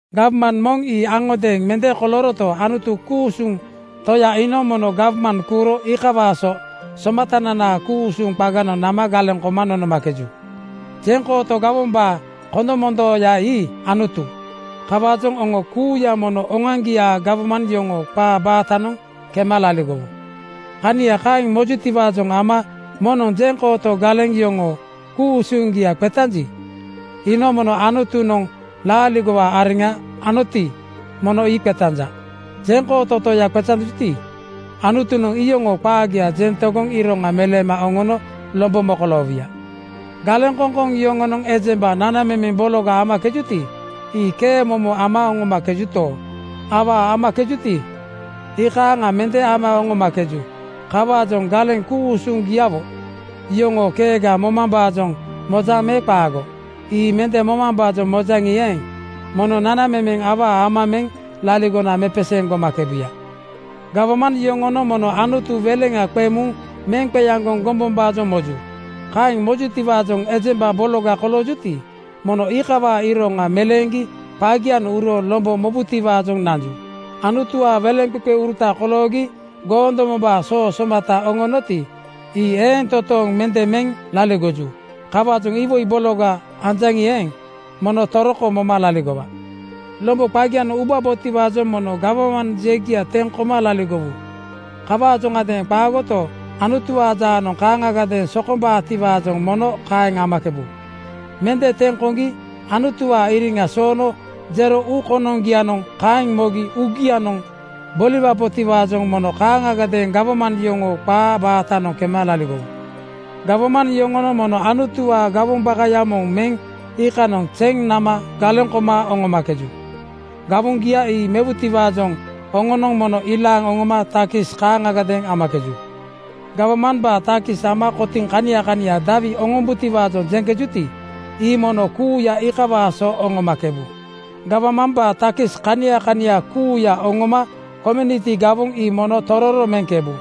Gawman moŋ ii aŋodeeŋ mende kolooroto, Anutu, ku-usuŋ Toya iinoŋ mono gawman kuuro iikawaa so Somatananaa ku-usuŋ qaganoŋ nama galeŋ koma nonomakeju. Jeŋkooto gawombaa kondomondooya ii Anutu. Kawaajoŋ oŋo kuuya mono oŋoaŋgiaa gawman yoŋoo qaa baatanoŋ kema laligowu. Kania kaeŋ mojutiwaajoŋ ama moŋnoŋ jeŋkooto galeŋ yoŋoo ku-usuŋgia qetanji, iinoŋ Anutunoŋ laaligowaa areŋa anoti, mono ii qetanja. Jeŋkooto Toya qetanjuti, Anutunoŋ iyoŋoo qaagia jeŋ tegoŋ iroŋa meleema oŋono lombo mokoloowuya. Galeŋkoŋkoŋ yoŋonoŋ ejemba nanamemeŋ bologa amakejuti, ii kee momo ama oŋomakejuto, awaa amakejuti, ii iikaaŋa mende ama oŋomakeju. Kawaajoŋ galeŋ ku-usuŋgiawo yoŋoo keega momambaajoŋ mojaŋ me qaago? Ii mende momambaajoŋ mojaŋi eeŋ, mono nanamemeŋ awaa ama meŋ laligona mepeseeŋ gomakebuya. Gawman yoŋonoŋ mono Anutu weleŋa qeŋ muŋ meŋ qeaŋgoŋ gombombaajoŋ moju. Kaeŋ mojutiwaajoŋ ejemba bologa koloojuti, mono iikawaa iroŋa meleeŋgi qagianoŋ uro lombo mobutiwaajoŋ nanju. Anutuwaa weleŋqeqeuruta koloogi goondomombaa soo somata oŋonoti, ii eeŋ totooŋ mende meŋ laligoju. Kawaajoŋ iwoi bologa anjaŋi eeŋ, mono toroko moma laligowa. Lombo qagianoŋ ubabotiwaajoŋ mono gawman jegia teŋ koma laligowu. Kawaajoŋadeeŋ qaagoto, Anutuwaa jaanoŋ kaaŋgadeeŋ sokombaatiwaajoŋ mono kaeŋ amakebu. Mende teŋ koŋgi Anutuwaa iriŋa soono jero uu konoŋgianoŋ kaeŋ mogi uugianoŋ boliwabotiwaajoŋ mono kaaŋagadeeŋ gawman yoŋoo qaa baatanoŋ kema laligowu. Gawman yoŋonoŋ mono Anutuwaa gawoŋ bakaya moŋ meŋ iikanoŋ zeŋ nama galeŋ koma oŋomakeju. Gawoŋgia ii mewutiwaajoŋ oŋonoŋ mono ilaaŋ oŋoma takis kaaŋagadeeŋ amakeju. Gawmambaa takis ama kotiŋ kania kania dawi oŋombutiwaajoŋ jeŋkejuti, ii mono kuuya iikawaa so oŋomakebu. Gawmambaa takis kania kania kuuya oŋoma komuniti gawoŋ ii mono tororo meŋkebu.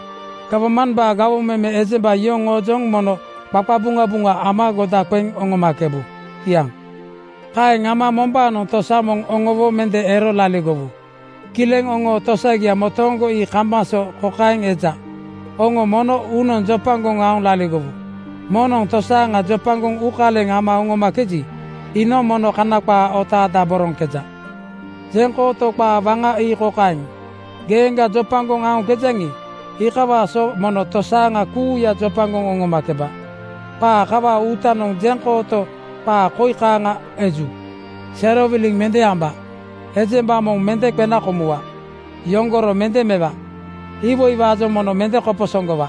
Gawmambaa gawoŋ meme ejemba yoŋoojoŋ mono qaqabuŋabuŋa ama goda qeŋ oŋomakebu. Kiaŋ. Kaeŋ ama mombaanoŋ tosa moŋ oŋowo mende ero laligowu. Kileŋ oŋoo tosagia motooŋgo ii kambaŋ so kokaeŋ eja: Oŋo mono uunoŋ jopagoŋ aoŋ laligowu. Moŋnoŋ tosaaŋa jopagoŋ uukaleŋ ama oŋomakeji, iinoŋ mono Kana qaa otaadaboroŋkeja. Jeŋkooto qaa waŋa ii kokaeŋ, “Geeŋga jopagoŋ aoŋkejaŋi, iikawaa so mono tosaaŋa kuuya jopagoŋ oŋomakeba.” Qaa kawaa uutanoŋ jeŋkooto qaa koi kaaŋa eju, “Serowiliŋ mende amba,” “Ejemba moŋ mende qena komuwa,” “Yoŋgoro mende mewa,” “Iwoiwaajoŋ mono mende koposoŋgowa.”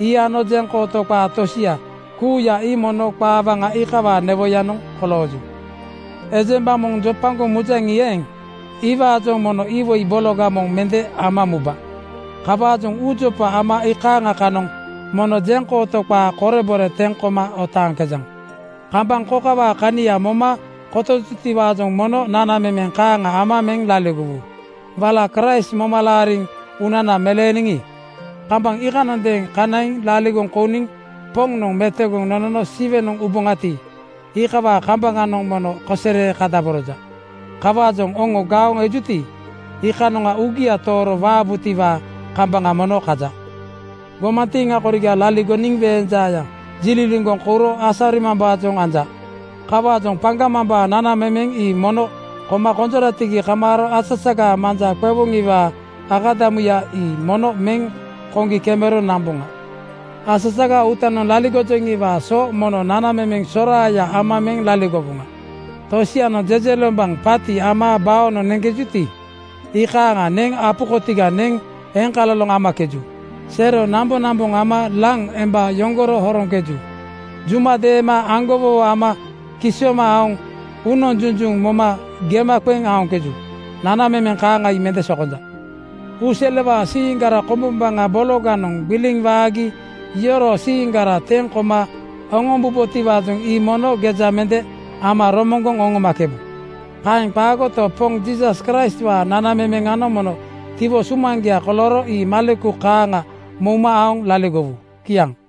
Ii ano jeŋkooto qaa tosia kuuya ii mono qaa waŋa iikawaa newoyanoŋ kolooju. Ejemba moŋ jopagoŋ mujaŋi eeŋ, iwaajoŋ mono iwoi bologa moŋ mende ama muba. Kawaajoŋ uujopa ama iikaaŋa kanoŋ mono jeŋkooto qaa korebore teŋ koma otaaŋkejaŋ. Kambaŋ kokawaa kania moma kotojutiwaajoŋ mono nanamemeŋ kaaŋa ama meŋ laligowu. Wala Kraist moma laariŋ uunana meleeniŋi, kambaŋ iikanondeeŋ kanaiŋ laligoŋ kouniŋ Poŋnoŋ metogoŋ nonono Siwenoŋ uboŋati, iikawaa kambaŋanoŋ mono kosere kadaboroja. Kawaajoŋ oŋo gaoŋ ejuti, iikanoŋa uugia tooro waabutiwaa kambaŋa mono kaja. Gomantiiŋa koriga laligoniŋ weeŋ jaaya jililiŋgoŋ kouro asarimambaajoŋ anja. Kawaajoŋ paŋgamambaa nanamemeŋ ii mono koma konjoratigi kamaaro asasagaa manja qewoŋiwaa akadamuya ii mono meŋ koŋgi kemero namboŋa. Asasagaa uutanoŋ laligojoŋiwaa so mono nanamemeŋ soraaya ama meŋ laligowoŋa. Tosianoŋ jejelombaŋ paati ama baonoŋ neŋkejuti, iikaaŋa neŋ apu kotiga neŋ eloŋkaloŋ amakeju. Sero namboŋnamboŋ ama laŋ emba yoŋgoro horoŋkeju. Juma deema aŋgowowo ama kisooma aoŋ uunoŋ junjuŋ moma gema qeŋ aoŋkeju. Nanamemeŋ kaaŋa ii mende sokonja. Uuselewaa siiŋgara kombombaŋa bologanoŋ gbiliŋ waagi yoroo siiŋgara teŋ koma oŋombubotiwaajoŋ ii mono geja mende ama romoŋgoŋ oŋomakebu. Kaeŋ qaagoto, Poŋ Jiisas Kraistwaa nanamemeŋanoŋ mono tiwo sumaŋgia kolooro ii maleku kaaŋa mouma aoŋ laligowu. Kiaŋ.